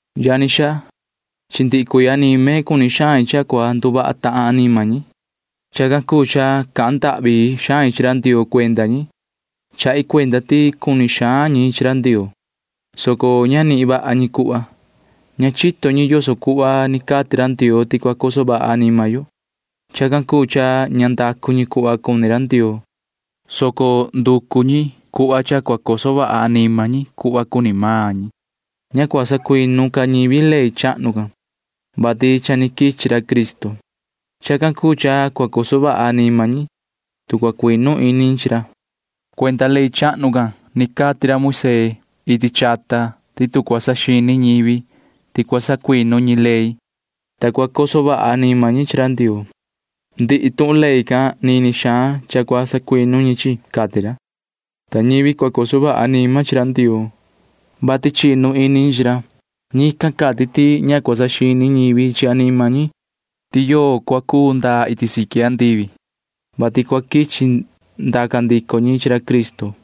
Yani xaa, chi ndihi cuii anime cuni xain cha cua nduvaha tahan anima ñi. Chacan cuu cha cahan ndahvi xain chi ra Ndioo cuenda ñi. Chahi cuenda ti cuni xaan ñi chi ra Ndioo, soco ña nihin vaha ñi cuhva. Ña chito ñi yoso cuhva ni cati ra Ndioo ti cua coso vaha anima yo. Chacan cuu cha ña ndacu ñi cuhva cuni ra Ndioo, soco nducu ñi cuhva cha cua coso vaha anima ñi cuhva cuni maan ñi. Ña cua sacuinu ca ñivi ley chahnu can, vati cha ni quichi ra Cristo. Chacan cuu cha cua coso vaha anima ñi, tu cua cuinu ini ñi chi ra. Cuenda ley chahnu can ni cati ra Moisee iti chata ti tu cua saxini ñivi ti cua sacuinu ñi ley, ta cua coso vaha anima ñi chi ra Ndioo, ndihi tuhun ley can cua sacuinu nini xaan ñi, cati ra. Ta ñivi cua coso vaha anima chi ra Ndioo, vati chinu ini ñi chi ra―ñican cati ti ña cua saxini ñivi chi anima ñi ti yoo cua cu ndaa iti siqui andivi, vati cua quichi ndaca ndico ñi chi ra Cristo,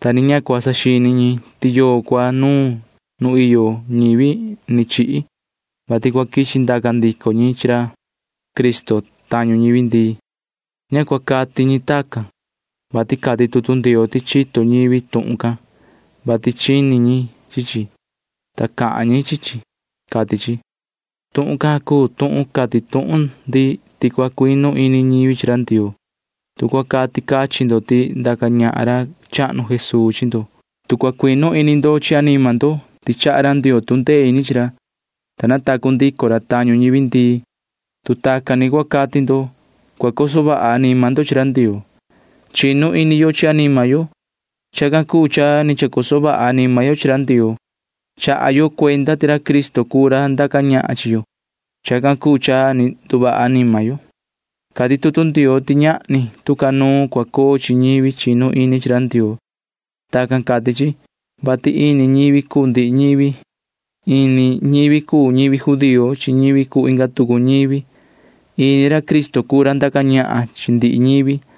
ta ni ña cua saxini ñi ti yoo cua nuun nu iyo ñivi ni chihi, vati cua quichi ndaca ndico ñi chi ra Cristo tañu ñivi ndii. Ña cua cati ñi tacan, vati cati tutu Ndioo ti chito ñivi tuhun can, vati chini ñi chi chi, ta cahan ñi chi chi, cati chi. Tuhun can cuu tuhun cati tuhun ndi ti cua cuinu ini ñivi chi ra Ndioo. Tu cua cati cachin ndo ti ndaca ñahan ra chahnu Jesuu chi ndo, tu cua cuinu ini ndo chi anima ndo ti chaha ra Ndioo tu ndee ini chi ra, ta natacu ndico ra tañu ñivi ndii, tu tacan ni cua cati ndo, cua coso vaha anima ndo chi ra Ndioo. Chinu ini yo chi anima yo. Chacan cuu cha ni chacoso vaha anima yo chi ra Ndioo. Chaha yo cuenda ti ra Cristo cuu ra ndaca ñahan chi yo. Chacan cuu cha ni nduvaha anima yo. Cati tutu Ndioo ti ñahni tu ca nuun cua coo chi ñivi chinu ini chi ra Ndioo. Tacan cati chi, vati ini ñivi cuu ndihi ñivi. Ini ñivi cuu ñivi judío chi ñivi cuu inga tucu ñivi. Ini ra Cristo cuu ra ndaca ñahan chi ndihi ñivi,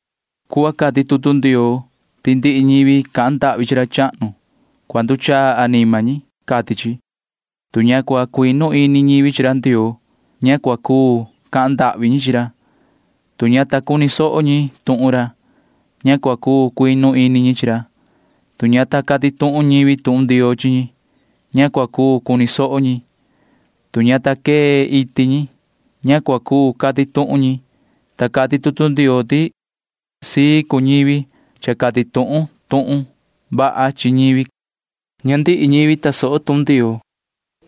cuhva cati tutu Ndioo ti ndihi ñivi cahan ndahvi chi ra chahnu―cua nduchaa anima ñi, cati chi. Tu ña ta cuinu ini ñivi chi ra Ndioo, ña cua cuu cahan ndahvi ñi chi ra. Tu ña ta cuni soho ñi tuhun ra, ña cua cuu cuinu ini ñi chi ra. Tu ña ta cati tuhun ñivi tuhun Ndioo chi ñi, ña cua cuu cuni soho ñi. Tu ña ta quee iti ñi, ña cua cuu cati tuhun ñi, ta cati tutu Ndioo ti sii cuni ñivi, vati cha quichi cati tuhun ñivi ra tuhun vaha, cati chi. Ña ndihi ñivi tasoho tuhun Ndioo,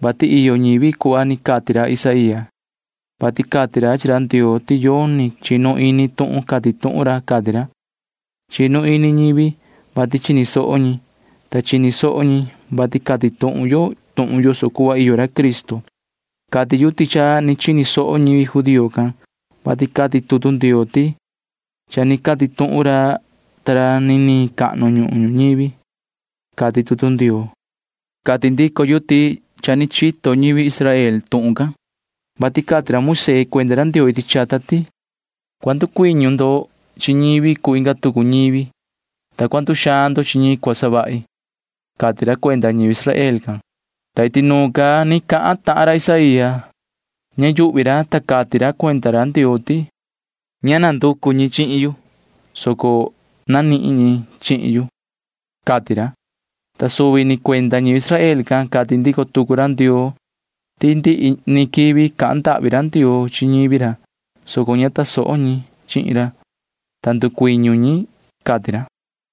vati iyo ñivi cuhva ni cati ra Isaía, vati cati ra chi ra Ndioo ti yoni chinu ini tuhun cati tuhun ra, cati ra. Chinu ini ñivi, vati chini soho ñi, ta chini soho ñi, vati cati tuhun yo tuhun yoso cuhva iyo ra Cristo. Cati yu ti cha ni chini soho ñivi judío can, [vati cati tutu Ndioo ti]: Cha ni cati tuhun ra ta ra nini cahnu nu ñuhun ñuñivi, cati tutu Ndioo. Cati ndico yu ti cha ni chito ñivi Israel tuhun can, vati cati ra Moisee cuenda ra Ndioo iti chata ti: Cua ndusoo ndo chi ñivi cuu inga tucu ñivi, ta cua nduxaan ndo chi ñi cua savahi, cati ra cuenda ñivi Israel can, ta iti nuun ca ni cahan tahan ra Isaía. Ña yuhvi ra, ta cati ra cuenda ra Ndioo ti: Ña nanducu ñi chihin yu, soco nanihin ñi chihin yu, cati ra, ta suvi ni cuenda ñivi Israel can cati ndico tucu ra Ndioo ti ndihi ni quivi cahan ndahvi ra Ndioo chi ñivi ra, soco ña tasoho ñi chihin ra, ta ndusoo cuni ñi, cati ra.